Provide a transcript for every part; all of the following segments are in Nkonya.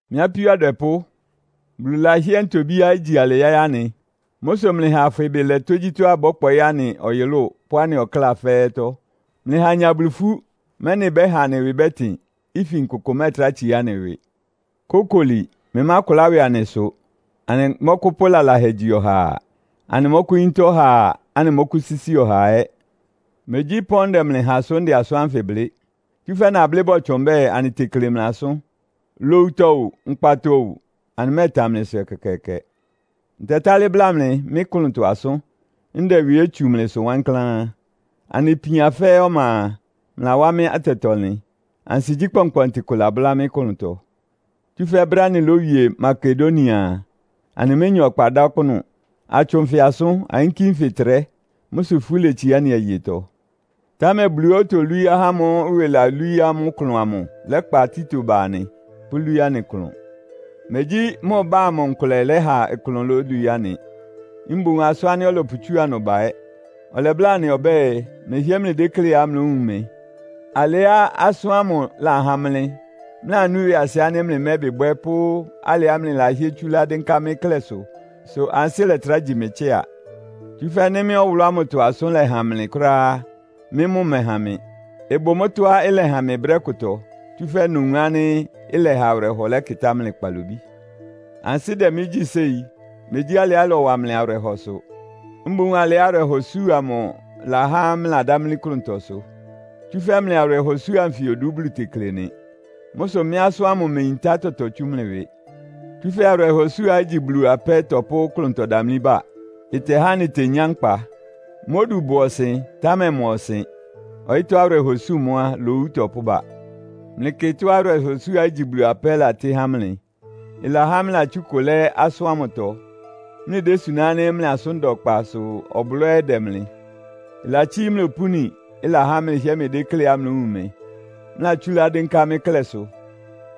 Mɩ́ apíó adwɛpʋ́, Bulu lahɩ́ɛ́ ntobíá igyi alɩ yáɩ́ anɩ. Mʋ́ sʋ mlɩha afwɩ ɩbɩ lɛ tógyítɔ́á ɩbɔ́kpɔɩ́ anɩ ɔyʋlʋ́ʋ pʋ́ anɩ ɔkláa fɛ́ɛ́tɔ́. Mlɩha anya Bulu ifú, mɛ́nɩ ɩbɛ́ha anɩ ɩwɩ bɛ́tɩn, ifin kʋkʋ mɛ́ɛtrá tsiá anɩ ɩwɩ. Kókoli, mlɩmákʋlá ɩwɩ anɩsʋ! Anɩmɔ́kʋ́pʋ́ lalahɛ gyi ɔhaa. Anɩmɔ́kʋ́yíntá ɔhaa, anɩmɔ́kʋ́sísi ɔhaa ɛ́. Megyí ɩpɔ́n ndɛ mlɩ ha sʋ́ ndɛ asʋ́n ánfɩ blɩ́. Tsúfɛ́ nablɩ́ bɔtsʋn mbɛ́ɛ, anɩtekle mlɩ asʋ́n. Lowutɔ o, nkpatɔ o, anɩmɛ́ɛtan mlɩsʋ ɛkɛkɛɛkɛ. Ntɛtálɩ́ bla mlɩ mɩ́ klʋntɔ asʋ́n, ndɛ ɩwɩ ɛ́ tsu mlɩsʋ wankláán. Anɩ ipian fɛ́ɛ́ ɔma a, mlɩlawá mɩ́ atɛtɔ-ɔnlɩn. Ansigyí kpɔnkpɔntɩ kʋ labʋ́lá mɩ́ klʋntɔ. Tsúfɛ́ brɛ́á anɩlówie Makedonia a, anɩménya ɔkpa dá ɔkpʋ́nʋ́. Atsʋn nfɩ asʋ́n, ayínkí nfɩ ɩtrɛ́. Mʋ́ sʋ ifú letsiá anɩ ayetɔ. Támɛ Buluá otolwíí ahá ámʋ́ʋ́ ɩwɩ lawú amʋ́ ɩklʋn amʋ lɛ́kpa Tito ba anɩ, pʋ́lwíí anɩ ɩklʋn. Megyí mʋ ɩbá amʋ nkʋlɛ lɛ́ha ɩklʋn lólwií anɩ, mboún asʋ́n ánɩ́ ɔlɔpʋtsúa ɩnʋ ba ɛ́. Ɔlɛbláa anɩ ɔbɛ́ɛ, mlɩhɩ́ɛ́ mlɩdékléá mlówun mɩ. Alɩá asʋ́n ámʋ lahan mlɩ, mlɩlanú ɩwɩasɩ ánɩ́ mlɩmɛ́bɩ bwɛ́ pʋ́ alɩá mlɩlahɩ́ɛ́ tsúlá dɩ́nká mɩ́ klɛ́sʋ, sʋ ansɩ́ lɛtrá gyi mɩ tsɩ́a. Tsúfɛ́ nɩ́ mɩ́ ɔwʋlʋ́ ámʋtɔ asʋ́n lɛhan mlɩ kʋ́ráá á, mɩ́ mʋ́ ɩmɛhan mɩ. Ɩbʋ mʋ́tɔ́á ɩlɛhan mɩ brɛ́ kʋtɔ, tsúfɛ́ nowun ánɩ́ ɩlɛha awɩrɛhɔ lɛ́kɩtá mlɩ kpalobí. Ansɩ́ dɛ mɩ́ gyí séi. Megyí alɩá ɩlɔwa mlɩ awɩrɛhɔ sʋ. Mboún alɩá awɩrɛhɔsú amʋ ɩlahá mlɩladámlí klʋntɔ sʋ. Tsúfɛ́ mlɩ awɩrɛhɔsú anfɩ odu Bulu tekle nɩ. Mʋ́ sʋ mɩ́ asʋ́n ámʋ imeyintá tɔtɔ tsú mlɩ ɩwɩ. Tsúfɛ́ awɩrɛhɔsúá igyi Bulu apɛ́ tɔpʋ́ klʋntɔdamlí bá. Ɩtɛhá anɩtenyá nkpa. Mʋ́ odu bʋ ɔsɩn, támɛ ɩma ɔsɩn. Ɔyɩ́tɔ́ awɩrɛhɔsú mʋ́ á, lowu ɩtɔpʋ́ba. Mlɩkɩ tɔ́á awɩrɛhɔsúá igyi Bulu apɛ́ latɩ́ há mlɩ! Ɩlahá mlɩlatsú ɩkʋ lɛ́ asʋ́n ámʋtɔ, mlɩdésuná ánɩ́ mlɩ asʋ́n da ɔkpa sʋ ɔblɔ́ ɛ́ dɛ mlɩ. Ɩlatsíí mlɩ opúni, ɩlahá mlɩhɩ́ɛ́ mlɩdékléá mlówun mɩ, mlɩlatsúlá dɩ́nká mɩ́ klɛ́sʋ.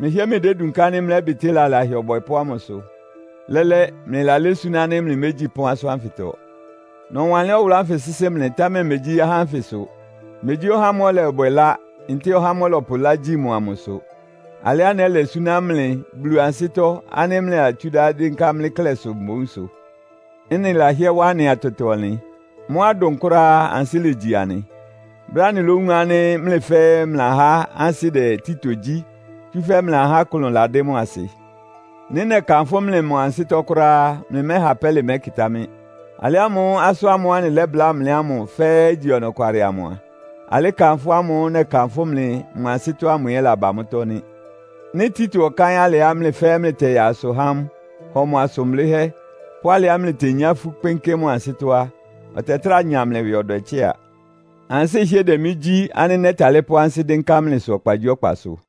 Mlɩhɩ́ɛ́ mlɩdédunká ánɩ́ mlɛ́bɩtɩ́ lalahɛ ɔbwɛpʋ́ ámʋ ɩsʋ. Lɛ́lɛ́, mlɩlalɛ́ súná ánɩ́ mlɩmégyi pɔ́n asʋ́n ánfɩtɔ. Nɔwanlɩ́n ɔwʋlʋ́ sɩ́sɩ́ mlɩ, támɛ megyí ahá ánfɩ sʋ. Megyí ɔhá ámʋ́ʋ́ ɔlɔbwɛ ɩlá, ntɛ́ɛ ɔhá ámʋ́ʋ́ ɔlɔpʋ ɩlá gyí mʋ amʋ sʋ. Alɩá nɛ́lɛ súná mlɩ Bulu ansɩ́tɔ́ ánɩ́ mlɩlatsúlá dɩ́nká mɩ́ klɛ́sʋ mboún sʋ. Ɩ́nɩ lahɩ́ɛ́ wá anɩ atɛtɔ-ɔnlɩn. Mʋ́á ɩdʋn kʋ́ráá á, ansɩ́ legyi anɩ, brɛ́á anɩlówun ánɩ́ mlɩ fɛ́ɛ́ mlɩlahá ansɩ́ dɛ Tito gyí, tsúfɛ́ mlɩlahá ɩklʋn ladɩ́ mʋ asɩ. Nɩ́ nɛkanfʋ́ mlɩ mʋ ansɩ́tɔ́ kʋ́ráá á, mlɩmɛ́ha pɛ́lɩ mɛkɩtá mɩ́. Alɩ ámʋ́ʋ́ asʋ́n ámʋ́ʋ́ anɩlɛ́bláa mlɩ ámʋ fɛ́ɛ́ igyi ɔnɔkwalɩ amʋ a, alɩ́ kanfʋ́ ámʋ́ʋ́ nɛkanfʋ́ mlɩ mʋ ansɩ́tɔ́ ámʋ ɛ́ laba mʋ́tɔ́ nɩ́. Nɩ́ Tito ɔkáɩ́n alɩá mlɩ fɛ́ɛ́ mlɩtɛyaa asʋ há mʋ, hɔ mʋ asʋn blɩ́hɛ́, pʋ́ alɩá mletenyá ifú kpɩ́nkɩ́ mʋ ansɩ́tɔ́ á, ɔtɛtráa nya mlɩ ɩwɩ ɔdwɛ tsɩ́a. Ansɩ́ ɩhɩ́ɛ́ dɛ mɩ́ gyí ánɩ́ nɛ́talɩ́ pʋ́ ansɩ́ dɩ́nká mlɩsʋ ɔkpagyíɔkpasʋ.